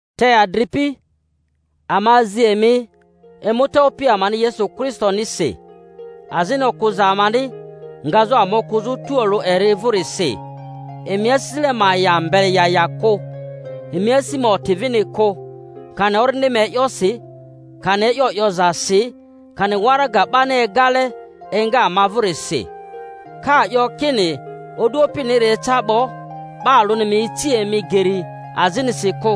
Te adripi, ama azi emi, emuta Opi amani Yesu Kristonisi, azini okᴜza amani ngazᴜ ama okᴜzᴜ tualᴜ eri vᴜrisi, emi asisile ma ya mbele ya ya kᴜ, emi asi ma oti vini kᴜ, kani orindi ma e'yosi, kani e'yo 'yozasi, kani waraga 'bani egale enga ama vᴜrisi, ka 'yo kini o'du Opiniri eca 'bo. 'Ba alᴜni ma ici emi geri azinisi kᴜ;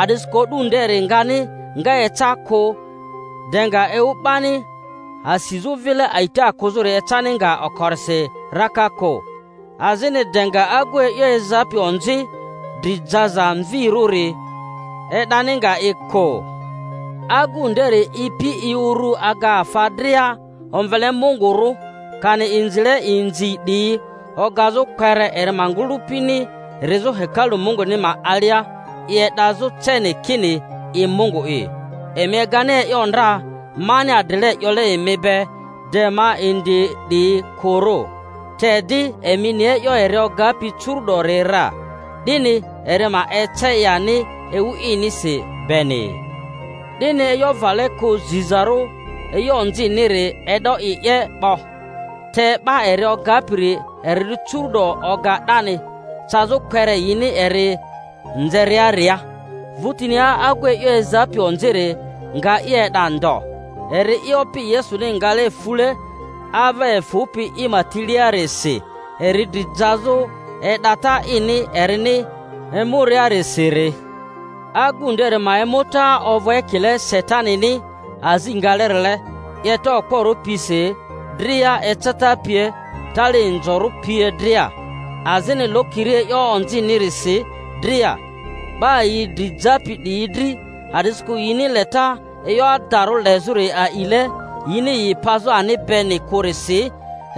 a'disikᴜ o'du nderi ngani nga eca kᴜ, de nga ewu 'bani asizᴜ vile a'ita kᴜzᴜri ecani nga okorisi raka kᴜ, azini de nga agu e'yo ezapi onzi, dri jaza mvirᴜri, e'dani nga i kᴜ. Agu nderi ipi i uru aga afa dria omvele Mungurᴜ, kani inzile inzi 'diyi ogazᴜ, kpere eri ma ngᴜlᴜpini rizᴜ hekalu Munguni ma alia i e'dazᴜ ceni, kini i Mungu'i. Emi egani e'yo ndra mani adrile 'yole emi be de ma indi 'diyi kᴜrᴜ? Te di, emi ni e'yo eri ogapi curu'dori ra, 'dini eri ma ece i ani ewu inisi beni. 'Dini e'yo vale kᴜ zizarᴜ e'yo onziniri e'do i 'ye 'bo; te 'ba eri ogapiri eri curu'do oga 'dani, cazᴜ kpere yini eri nzeriaria. Vᴜtinia agu e'yo ezapi onziri nga i e'da ndo, eri'i Opi Yesuni ngale fule ava efᴜpi i ma tiliarisi, eri dri jazᴜ e'data ini erini emuriarisiri. Agu nderi ma emuta ovᴜ ekile Satanini azi ngalerile, 'yeta okporᴜ pisi dria eceta pie, tali inzorᴜ pie dria, azini lokiri e'yo onzinirisi dria 'ba yi dri japi 'diyi dri, a'disikᴜ yini leta e'yo adarᴜ lezᴜri a'ile yini yi pazᴜ ani beni kᴜrisi.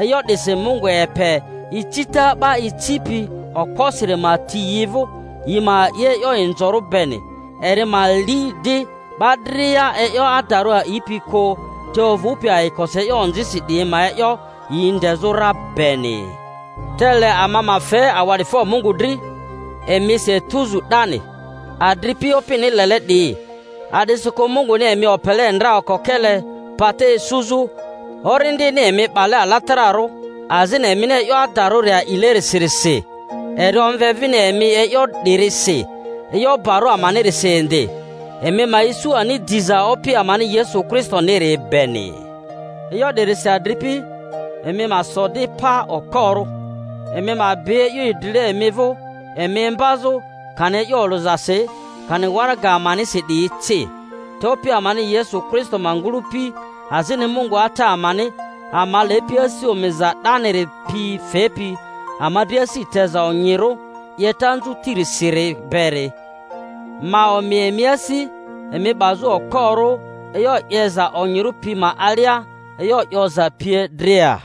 E'yo 'disi Mungu epe icita 'ba icipi okposiri ma ti yi vᴜ, yi ma a'i e'yo inzorᴜ beni, eri ma li di'ba dria e'yo adarᴜ a'ipi kᴜ, te ovᴜpi ayikosi e'yo onzisi 'diyi ma e'yo, yi ndezᴜ ra beni. Te le ama ma fe awa'difo Mungu dri emisi etuzu 'dani, adripi Opini lele 'diyi, a'disikᴜ Munguni emi opele ndra okokele pata isuzᴜ, Orindini emi 'bale alatararᴜ azini emini e'yo adarᴜri a'ilerisirisi. Eri omve vini emi e'yo 'dirisi e'yo barᴜ amanirisi indi, emi ma isu ani diza Opi amani Yesu Kristoniri beni. E'yo 'dirisi, adripi, emi ma so di pa okporᴜ, emi ma bi e'yo idrile emi vᴜ emi imbazᴜ, kani e'yo olᴜzasi kani waraga amanisi 'diyi ci. Te Opi amani Yesu Kristo ma ngᴜlᴜpi, azini Mungu Ata amani, ama lepi, asi omiza 'daniri pi fepi ama dri asi teza onyirᴜ 'yeta anzᴜti-risiri beri ma omi emi asi, emi 'bazᴜ okporᴜ e'yo 'yeza onyirᴜ pi ma alia e'yo 'yoza pie dria.